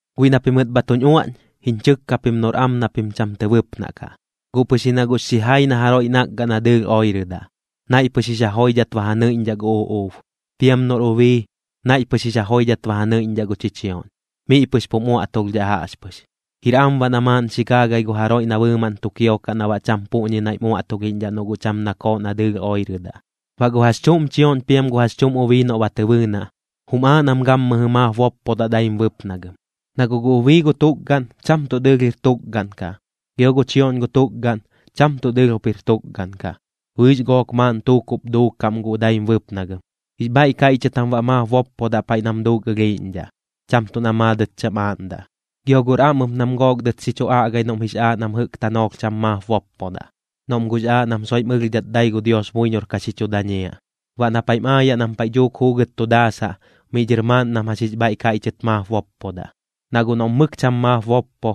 Guiꞌ na pimɨt bha tuñ uaꞌñ, jiñ chɨkka pim noꞌr am na pim cham tɨ bɨpnaꞌ kaꞌ. Guꞌ pɨx ji na guꞌx xijai na jaroiꞌ nakgaꞌ na dɨɨlh oirɨdaꞌ, naiꞌ pɨx jix ja joidhat ba ja nɨiꞌñdhaꞌ gu uꞌuub. Piam noꞌr ubii, naiꞌ pɨx jix ja joidhat ba ja nɨiꞌñdhaꞌ gu chichioꞌñ, miꞌ pɨx pum uaꞌtulhdhaꞌ jaꞌxpɨx. Jir am baꞌ na maaꞌn xi gaagai gu jaroiꞌ na bɨɨmaꞌn tu kiokaꞌ na baꞌ cham puꞌñi naiꞌm uaꞌtulhiꞌñdhaꞌ noꞌ guꞌ cham nakooꞌ na dɨɨlh oirɨdaꞌ. Baꞌ gu jax chuꞌm chioꞌñ piam gu jax chuꞌm ubii noꞌ ba tɨ bɨɨnaꞌ, jum aaꞌ nam gammɨjɨ maap boppodaꞌ daim bɨpnagɨm. Na guꞌ gu ubii gu tukgaꞌn, cham tuꞌ dɨɨlh jir tukgaꞌn kaꞌ, gio gu chioꞌñ gu tukgaꞌn, cham tuꞌ dɨɨlh jup jir tukgaꞌn kaꞌ. Bɨɨx gook maaꞌn tuukuꞌp duukaꞌm guꞌ daim bɨpnagɨm. Jix bhaiꞌ kaiꞌchɨt jam baꞌ maap boppodaꞌ paiꞌ nam duuk ɨlhiiꞌñdhaꞌ, cham tuꞌ na maadɨt cham aaꞌndaꞌ. Gio guꞌr am ɨp nam gook dɨt xi chu aꞌgai noꞌm jix aaꞌ nam jɨꞌk tanoolh cham maap boppodaꞌ, noꞌm guꞌx aaꞌ nam soiꞌm ɨlhdhat dai gu Dios buiñor ka xi chu dañiaꞌ. Baꞌ na paiꞌm aayaꞌ nam paiꞌ dhuuk juugɨt tu daasaꞌ, miꞌ dhɨr maaꞌn nam jax jix bhaiꞌ kaiꞌchɨt maap boppodaꞌ. Na guꞌ noꞌm mɨk cham maap boppo,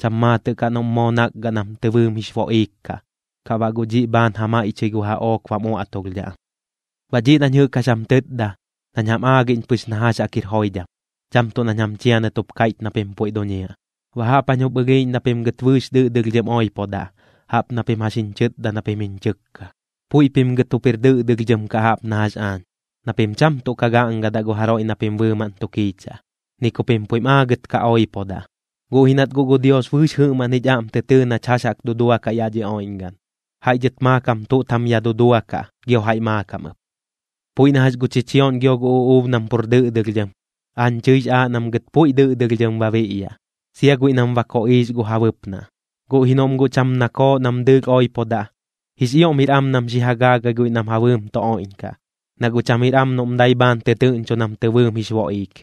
cham maatɨꞌ kaꞌ noꞌm moo nakgaꞌ nam tɨ bɨɨm jix boꞌiik kaꞌ, kaꞌ baꞌ guꞌ dhiꞌ bhaan ja maiꞌchɨi gu jaꞌook bam uaꞌtulhdhaꞌ am. Baꞌ dhiꞌ nañ jɨꞌk jax jam tɨtda, nañ jam aagiꞌñ pɨx na jax jaꞌk jir joidham, cham tuꞌ nañ jam chianɨt jup kaiꞌch na pim puiꞌ duñiaꞌ. Baꞌ jaꞌp jañ jup ɨlhiiꞌñ na pim gɨt bɨɨx dɨꞌdɨlhdhɨm oipodaꞌ, jaꞌp na pim jax jiñ chɨtda na pim jiñ chɨkka. Puiꞌ pim gɨt jup jir dɨꞌdɨlhdhɨm kaꞌ jaꞌp na jax aañ, na pim cham tuꞌ ka gaꞌngadaꞌ gu jaroiꞌ na pim bɨɨmaꞌn tu kiichaꞌ, ni ku pim puiꞌm aagɨt ka oipodaꞌ. Guꞌ ji nat guꞌ gu Dios bɨɨx jɨꞌmaꞌn jich aꞌm tɨ tɨɨ nach jax jaꞌk duduakaꞌ yaꞌ dhi oiꞌñgaꞌn, jaiꞌ dhɨt maakam tuꞌt jam ya duduakaꞌ, gio jaiꞌ maakam ɨp. Puiꞌ na jax gu chichioꞌñ gio gu uꞌuub nam pur dɨꞌdɨlhdhɨm, aañ chɨix aaꞌ nam gɨt puiꞌ dɨꞌdɨlhdhɨm ba biꞌyaꞌ, sia guiꞌ nam ba koꞌiix gu ja bɨpnaꞌ. Guꞌ ji noꞌm guꞌ cham nakooꞌ nam dɨɨlh oipodaꞌ, jix ioꞌm jir am nam xi ja gaagai guiꞌ nam ja bɨɨm tu oiꞌñkaꞌ, na guꞌ cham jir am noꞌm dai bhaan tɨ tɨꞌñcho nam tɨ bɨɨm jix boꞌiik.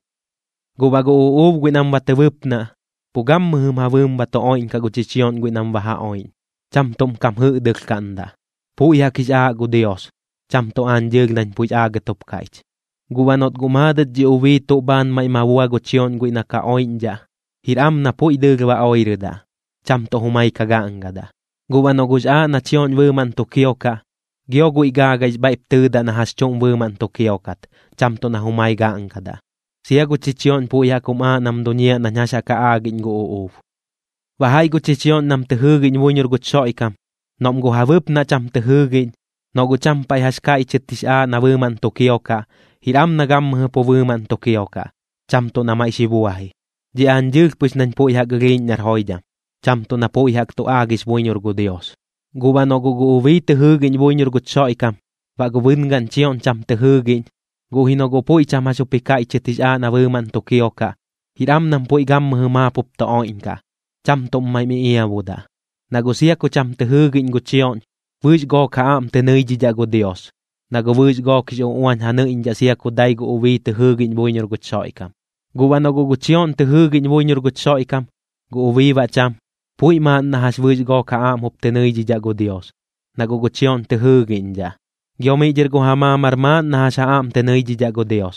Guꞌ baꞌ gu uꞌuub guiꞌ nam ba tɨ bɨpnaꞌ, pu gammɨjɨm ja bɨɨm ba tu oiꞌñkaꞌ gu chichioꞌñ guiꞌ nam ba ja oiꞌñ, cham tuꞌm kam jɨꞌdɨlhkaꞌndaꞌ. Puiꞌ jaꞌk jix aaꞌ gu Dios, cham tuꞌ aañ dɨɨlh nañ puiꞌx aagɨt jup kaiꞌch. Guꞌ baꞌ noꞌt guꞌ maadɨt dhi ubii jax dhuuk tuꞌ bhaan maiꞌ ma bua gu chioꞌñ guiꞌ na ka oiꞌñdhaꞌ, jir am na puiꞌ dɨɨlh ba oirɨdaꞌ, cham tuꞌ jumai ka gaꞌngadaꞌ. Guꞌ baꞌ noꞌ guꞌx aaꞌ na chioꞌñ bɨɨmaꞌn tu kiokaꞌ, gio guiꞌ gaagaix bhaiꞌp tɨɨdaꞌ na jax chuꞌm bɨɨmaꞌn tu kiokat, cham tuꞌ na jumai gaꞌngadaꞌ. Sia gu chichioꞌñ puiꞌ jaꞌk jum aaꞌ nam duñiaꞌ nañ jax jaꞌk ja aagiꞌñ gu uꞌuub. Baꞌ jaiꞌ gu chichioꞌñ nam tɨ jɨɨgiꞌñ buiñor guch Xoiꞌkam, noꞌm gu ja bɨpnaꞌ cham tɨ jɨɨgiꞌñ, noꞌ guꞌ cham paiꞌ jax kaiꞌchɨt jix aaꞌ na bɨɨmaꞌn tu kiokaꞌ, jir am na gammɨjɨ pu bɨɨmaꞌn tu kiokaꞌ, cham tuꞌ na maiꞌ xi buaji. Dhiꞌ aañ dɨɨlh pɨx nañ puiꞌ jaꞌk ɨlhiiꞌñ nar joidham, cham tuꞌ na puiꞌ jaꞌk tu aagix buiñor gu Dios. Guꞌ baꞌ noꞌ guꞌ gu ubii tɨ jɨɨgiꞌñ buiñor guch Xoiꞌkam, baꞌ gu bɨngaꞌn chioꞌñ cham tɨ jɨɨgiꞌñ, guꞌ ji noꞌ guꞌ puiꞌ cham jax jup ji kaiꞌchɨt jix aaꞌ na bɨɨmaꞌn tu kiokaꞌ, jir am nam puiꞌ gammɨjɨ maap jup tu oiꞌñkaꞌ, cham tuꞌm maiꞌm iꞌiabudaꞌ. Na guꞌ sia ku cham tɨ jɨɨgiꞌñ gu chioꞌñ, bɨɨx gook ja aꞌm tɨ nɨidhidhaꞌ gu Dios, na guꞌ bɨɨx gook jix uꞌuañ ja nɨiꞌñdhaꞌ sia ku dai gu ubii tɨ jɨɨgiꞌñ buiñor guch Xoiꞌkam. Guꞌ baꞌ noꞌ guꞌ gu chioꞌñ tɨ jɨɨgiꞌñ buiñor guch Xoiꞌkam, gu ubii baꞌ cham, puiꞌ maaꞌn na jax bɨɨx gook ja aꞌm jup tɨ nɨiꞌñdhaꞌ gu Dios, na guꞌ gu chioꞌñ tɨ jɨɨgiꞌñdhaꞌ. Gio miꞌ dhɨr gu ja maamar maaꞌn na jax ja aꞌm tɨ nɨidhidhaꞌ gu Dios,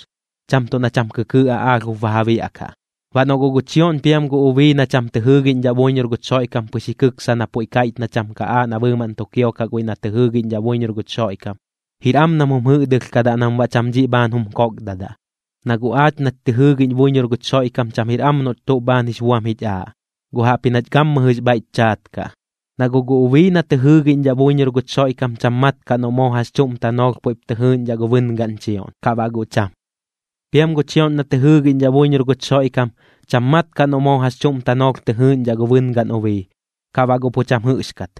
cham tuꞌ na cham kɨkɨɨꞌ aꞌaalh jup ba ja biaꞌkaꞌ. Baꞌ noꞌ guꞌ gu chioꞌñ piam gu ubii na cham tɨ jɨɨgiꞌñdhaꞌ buiñor guch Xoiꞌkam pɨx ji kɨksa na puiꞌ kaiꞌch na cham ka aaꞌ na bɨɨmaꞌn tu kiokaꞌ guiꞌ na tɨ jɨɨgiꞌñdhaꞌ buiñor guch Xoiꞌkam, jir am nam jum jɨꞌdɨlhkadaꞌ nam baꞌ cham dhiꞌ bhaan jum kokdadaꞌ. Na guꞌ aach nach tɨ jɨɨgiꞌñ buiñor guch Xoiꞌkam cham jir am noꞌch tuꞌ bhaan jix buam jich aaꞌ, guꞌ jaꞌpji nach gammɨjɨx bhaiꞌch chaat kaꞌ. Na guꞌ gu ubii na tɨ jɨɨgiꞌñdhaꞌ buiñor guch Xoiꞌkam cham mat kaꞌ noꞌ moo jax chuꞌm tanoolh puiꞌp tɨ jɨɨꞌñdhaꞌ gu bɨngaꞌn chioꞌñ, kaꞌ baꞌ guꞌ cham. Piam gu chioꞌñ na tɨ jɨɨgiꞌñdhaꞌ buiñor guch Xoiꞌkam, cham mat kaꞌ noꞌ moo jax chuꞌm tanoolh tɨ jɨɨꞌñdhaꞌ gu bɨngaꞌn ubii, ka baꞌ guꞌ pu cham jɨꞌxkat.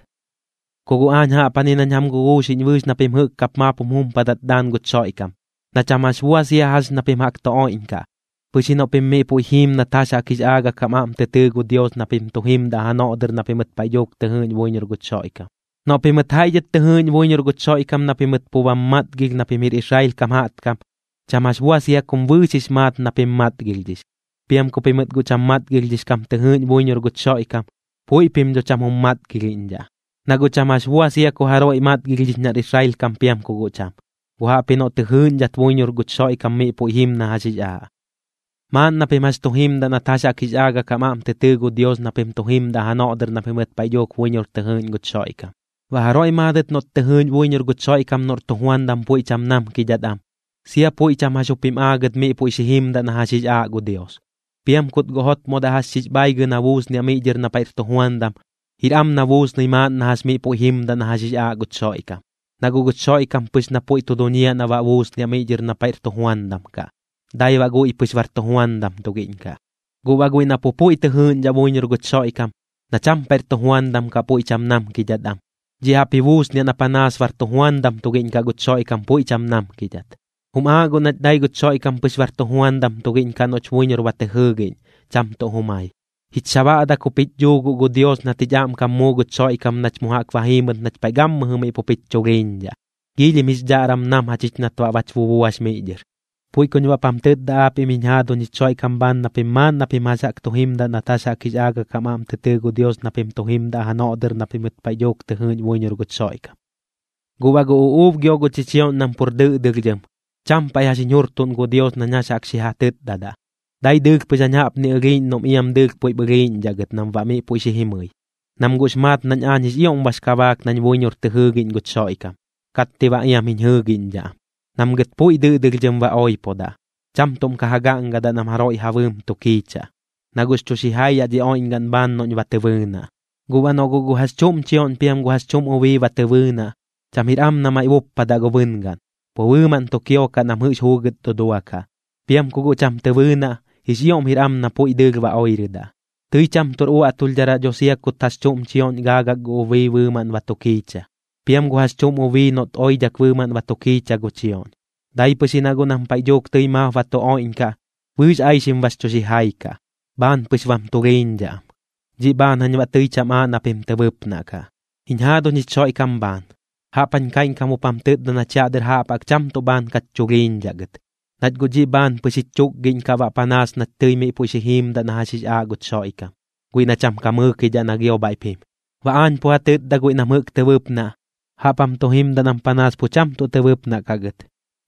Ku guꞌ aañ jaꞌpjani nañ jam guguuxiꞌñ bɨɨx na pim jɨꞌk kap maap jum jumpadat daan guch Xoiꞌkam, na cham jax bua sia jax ña pim jaꞌk tu oiꞌñkaꞌ, pɨx ji noꞌ pim miꞌ puiꞌ jiim nat jax jaꞌk jix aagak jam aꞌm tɨ tɨɨ gu Dios na pim tu jimdaꞌ janoꞌ dɨr na pimɨt paiꞌ dhuuk tɨ jɨɨꞌñ buiñor guch Xoiꞌkam. Noꞌ pimɨt jaiꞌ dhɨt tɨ jɨɨꞌñ buiñor guch Xoiꞌkam na pimɨt pu bam matgilh na pim jir Israel kam jaꞌtkam, cham jax bua sia kum bɨɨx jix maat na pim matgilhdhix. Piam ku pimɨt guꞌ cham matgilhdhix kam tɨ jɨɨꞌñ buiñor guch Xoiꞌkam, puiꞌ pim dho cham jum matgilhiꞌñdhaꞌ. Na guꞌ cham jax bua sia ku jaroiꞌ matgilhdhix nar Israel kam piam ku guꞌ cham, guꞌ jaꞌpji noꞌ tɨ jɨɨꞌñdhat buiñor guch Xoiꞌkam miꞌ puiꞌ jim na jax jix aaꞌ. Maaꞌn na pim jax tu jimdaꞌ nat jax jaꞌk jix aagak jam aꞌm tɨ tɨɨ gu Dios na pim tu jimdaꞌ janoꞌ dɨr na pimɨt paiꞌ dhuuk buiñor tɨ jɨɨꞌñ guch Xoiꞌkam. Baꞌ jaroiꞌ maadɨt noꞌt tɨ jɨɨꞌñ buiñor guch Xoiꞌkam noꞌr tujuandam puiꞌ cham namkidhat am, sia puiꞌ cham jax jup jim aagɨt miꞌ puiꞌ xi jimdaꞌ na jax jix aaꞌ gu Dios. Piam kut guꞌ jotmodaꞌ jax xix bhaaigɨ na buusniaꞌ miꞌ dhɨr na paiꞌr tujuandam, jir am na buusnɨi maaꞌn na jax miꞌ puiꞌ jimdaꞌ na jax jix aaꞌ guch Xoiꞌkam. Na guꞌ guch Xoiꞌkam pɨx na puiꞌ tu duñiaꞌ na baꞌ buusniaꞌ miꞌ dhɨr na paiꞌr tujuandam kaꞌ, dai baꞌ guiꞌ pɨx bar tujuandam tugiꞌñ kaꞌ. Guꞌ baꞌ guiꞌ na pu puiꞌ tɨ jɨɨꞌñdhaꞌ buiñor guch Xoiꞌkam, na cham paiꞌr tujuandam kaꞌ puiꞌ cham namkidhat am, dhiꞌ jaꞌp ji buusniaꞌ na panaas bar tujuandam tugiꞌñ kaꞌ guch Xoiꞌkam puiꞌ cham namkidhat. Jum aaꞌ guꞌ nach dai guch Xoiꞌkam pɨx bar tujuandam tugiꞌñ kaꞌ noꞌch buiñor ba tɨ jɨɨgiꞌñ, cham tuꞌ jumai. Jich xabaꞌdak jup jich dhuu guꞌ gu Dios nat jich aꞌmkam muu guch Xoiꞌkam nach mu jaꞌk ba jiimɨt nach paiꞌ gammɨjɨ miꞌ pup jich chulhiiñdhaꞌ, giilhim jix dhaꞌram nam jachich nat baꞌ bach bubuax miꞌ dhɨr. Puiꞌ kuñ baꞌp jam tɨtda aapiꞌm jiñ jaaduñ jich Xoiꞌkam bhaan na pim maaꞌn na pim jax jaꞌk tu jimdaꞌ nat jax jaꞌk jix aagak jam aꞌm tɨ tɨɨ gu Dios na pim tu jimdaꞌ janoꞌ dɨr na pimɨt paiꞌ dhuuk tɨ jɨɨꞌñ buiñor guch Xoiꞌkam. Guꞌ baꞌ gu uꞌuub gio gu chichioꞌñ nam pur dɨꞌdɨlhdhɨm, cham paiꞌ jax jiñ jurtuꞌn gu Dios nañ jax jaꞌk xi ja tɨtdadaꞌ, dai dɨɨlh pɨx jañ jaꞌpni ɨlhiiꞌñ noꞌm iam dɨɨlh puiꞌp ɨlhiiꞌñdhaꞌ gɨt nam baꞌ miꞌ puiꞌ xi jimɨi, nam guꞌx maat nañ aañ jix ioꞌm bax kabaak nañ buiñor tɨ jɨɨgiꞌñ guch Xoiꞌkam, katti baꞌ iam jiñ jɨɨgiꞌñdhaꞌ am. Nam gɨt puiꞌ dɨꞌdɨlhdhɨm ba oipodaꞌ, cham tuꞌm ka ja gaꞌngadaꞌ nam jaroiꞌ ja bɨɨm tu kiichaꞌ, na guꞌx chu xijai yaꞌ dhi oiꞌñgaꞌn bhaan noꞌñ ba tɨ bɨɨnaꞌ. Guꞌ baꞌ noꞌ guꞌ gu jax chuꞌm chioꞌñ piam jax chuꞌm ubii ba tɨ bɨɨnaꞌ, cham jir am na maiꞌ buppadaꞌ gu bɨngaꞌn, pu bɨɨmaꞌn tu kiokaꞌ nam jɨꞌx juugɨt duduakaꞌ. Piam ku guꞌ cham tɨ bɨɨnaꞌ, jix ioꞌm jir am na puiꞌ dɨɨlh ba oirɨdaꞌ. Tɨi cham tuꞌr uaꞌtulhdharaꞌ dho sia kut jax chuꞌm chioꞌñ gaagak gu ubii bɨɨmaꞌn ba tu kiicha, piam gu jax chuꞌm ubii noꞌt oidhak bɨɨmaꞌn ba tu kiicha gu chioꞌñ, dai pɨx ji na guꞌ nam paiꞌ dhuuk tɨi maap ba tu oiꞌñkaꞌ, bɨɨx aixim bax chu xijai kaꞌ, bhaan pɨx bam tulhiiñdhaꞌ am. Dhiꞌ bhaan jañ baꞌ tɨi cham aaꞌ na pim tɨ bɨpnaꞌ kaꞌ. Jiñ jaaduñ jich Xoiꞌkam bhaan, jaꞌp jañ kaiꞌñkam jup jam tɨtda nach yaꞌ dɨr jaꞌp jaꞌk cham tuꞌ bhaan kach chulhiiñdhaꞌ gɨt, nach guꞌ dhiꞌ bhaan pɨx jich chukgiꞌñ kaꞌ baꞌ panaas nach tɨi miꞌ puiꞌ xi jiimdaꞌ na jax jix aaꞌ guch Xoiꞌkam, guiꞌ na cham ka mɨɨkidhaꞌ na gio bhaiꞌp jim. Baꞌ aañ pu ja tɨtda guiꞌ nam jɨꞌk tɨ bɨpnaꞌ, jaꞌp jam tu jimdaꞌ nam panaas pu cham tuꞌ tɨ bɨpnaꞌ kaꞌ gɨt.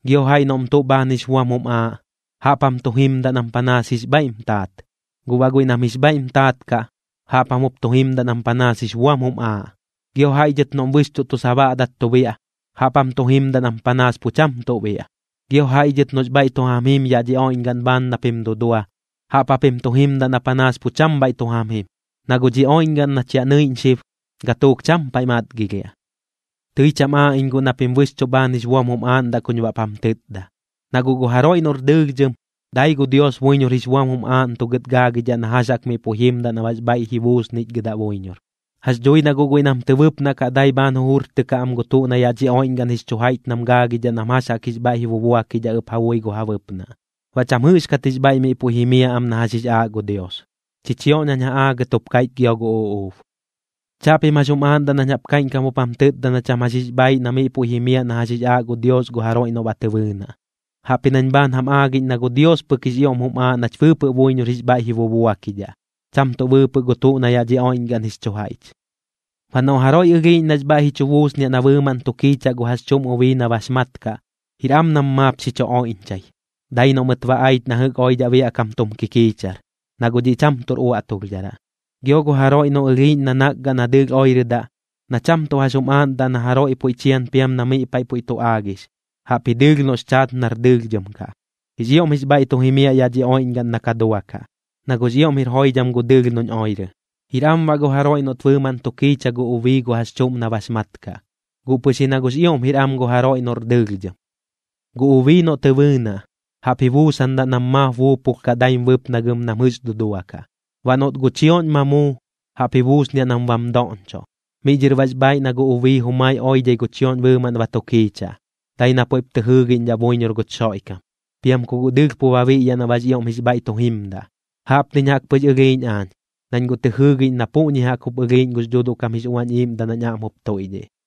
Gio jaiꞌ noꞌm tuꞌ bhaan jix buam jum aaꞌ, jaꞌp jam jup tu jimdaꞌ nam panaas jix bhaiꞌm taat. Guꞌ baꞌ guiꞌ nam jix bhaiꞌm taat kaꞌ, jaꞌp jam jup tu jimdaꞌ nam panaas jix buam jum aaꞌ. Gio jaiꞌ dhɨt noꞌm bɨxchuꞌ tu sabaꞌdat tu biaꞌ, jaꞌp jam tu jimdaꞌ nam panaas pu cham tuꞌ biaꞌ. Gio jaiꞌ dhɨt noꞌx bhaiꞌ tu jam jim yaꞌ dhi oiꞌñgaꞌn bhaan na pim dudua, jaꞌp japim tu jimdaꞌ na panaas pu cham bhaiꞌ tu jam jim, na guꞌ dhi oiꞌñgaꞌn nach yaꞌ nɨiꞌñ xib, gatuuk cham paiꞌ matgilhiaꞌ. Tɨi cham aaꞌ iñ guꞌ na pim bɨxchuꞌ bhaan jix buam jum aaꞌndaꞌ kuñ baꞌp jam tɨtda. Na guꞌ gu jaroiꞌ noꞌr dɨɨlhdhɨm, dai gu Dios buiñor jix buam jum aaꞌntugɨt gaagidhaꞌ na jax jaꞌk miꞌ puiꞌ jimdaꞌ na baꞌx bhaiꞌ ji buusnichgɨdaꞌ buiñor. Jax dhui na guꞌ guiꞌ nam tɨ bɨpnaꞌ kaꞌ dai bhaan jujurtɨkaꞌ am gu tuꞌ na yaꞌ dhi oiꞌñgaꞌn jix chu jaiꞌch nam gaagidhaꞌ nam jax jaꞌk jix bhaiꞌ ji bubuakidhaꞌ ɨp ja bui gu ja bɨpnaꞌ, baꞌ cham jɨꞌxkat jix bhaiꞌ miꞌ puiꞌ jimiaꞌ am na jax jix aaꞌ gu Dios. Chichioꞌñ jañ ja aagɨt jup kaiꞌch gio gu uꞌuub. Chaꞌpim jax jum aaꞌndaꞌ nañ jaꞌp kaiꞌñkam jup jam tɨtda na cham jax jix bhaaiꞌ na miꞌ puiꞌ jimiaꞌ na jax jix aaꞌ gu Dios gu jaroiꞌ noꞌ ba tɨ bɨɨnaꞌ, jaꞌpji nañ bhaan jam aagiꞌñ na gu Dios pɨk jix ioꞌm jum aaꞌ nach bɨɨpɨꞌ buiñor jix bhaiꞌ ji bubuakidhaꞌ, cham tuꞌ bɨɨpɨꞌ gu tuꞌ na yaꞌ dhi oiꞌñgaꞌn jix chu jaiꞌch. Baꞌ noꞌ jaroiꞌ ɨlhiiꞌñ nax bhaiꞌ ji chu buusniaꞌ na bɨɨmaꞌn tu kiichaꞌ gu jax chuꞌm ubii na bax mat kaꞌ, jir am nam maap xi chu oiꞌñchai, dai noꞌ mɨt ba aich na jɨꞌk oidhaꞌ biaꞌ kam tum kikiichar, na guꞌ dhiꞌ cham tuꞌr uaꞌtulhdharaꞌ. Gio gu jaroiꞌ noꞌ ɨlhiiꞌñ na nakgaꞌ na dɨɨlh oirɨdaꞌ, na cham tuꞌ jax jum aaꞌndaꞌ na jaroiꞌ puiꞌ chian piam na miꞌ paiꞌ puiꞌ tu aagix, jaꞌpji dɨɨlh noꞌx chaat nar dɨɨlhdhɨm kaꞌ, jix ioꞌm jix bhaiꞌ tu jimiaꞌ yaꞌ dhi oiꞌñgaꞌn na ka duakaꞌ, na guꞌx ioꞌm jir joidham gu dɨɨlh noꞌñ oirɨ. Jir am baꞌ gu jaroiꞌ noꞌt bɨɨmaꞌn tu kiichaꞌ gu ubii gu jax chuꞌm na bax mat kaꞌ, guꞌ pɨx ji na guꞌx ioꞌm jir am gu jaroiꞌ noꞌr dɨɨlhdhɨm. Gu ubii noꞌ tɨ bɨɨnaꞌ, jaꞌp ji buusandaꞌ nam maap buupulh kaꞌ daim bɨpnagɨm nam jɨꞌx duduakaꞌ. Baꞌ noꞌt gu chioꞌñ ma muu, jaꞌp ji buusniaꞌ nam bam doꞌñchoꞌ. Miꞌ dhɨr baꞌx bhaaiꞌ na gu ubii jumai oidhai gu chioꞌñ bɨɨmaꞌn ba tu kiichaꞌ, dai na puiꞌp tɨ jɨɨgiꞌñdhaꞌ buiñor guch Xoiꞌkam. Piam ku guꞌ dɨɨlh pu ba biꞌyaꞌ na baꞌx ioꞌm jix bhaiꞌ tu jimdaꞌ. Jaꞌpniñ jaꞌk pɨx ɨlhiiꞌñ aañ, nañ guꞌ tɨ jɨɨgiꞌñ na puꞌñi jaꞌk jup ɨlhiiꞌñ gux Dhuuduꞌ kam jix Uañ Iiꞌmdaꞌ nañ aꞌm jup tuiꞌdhiꞌ.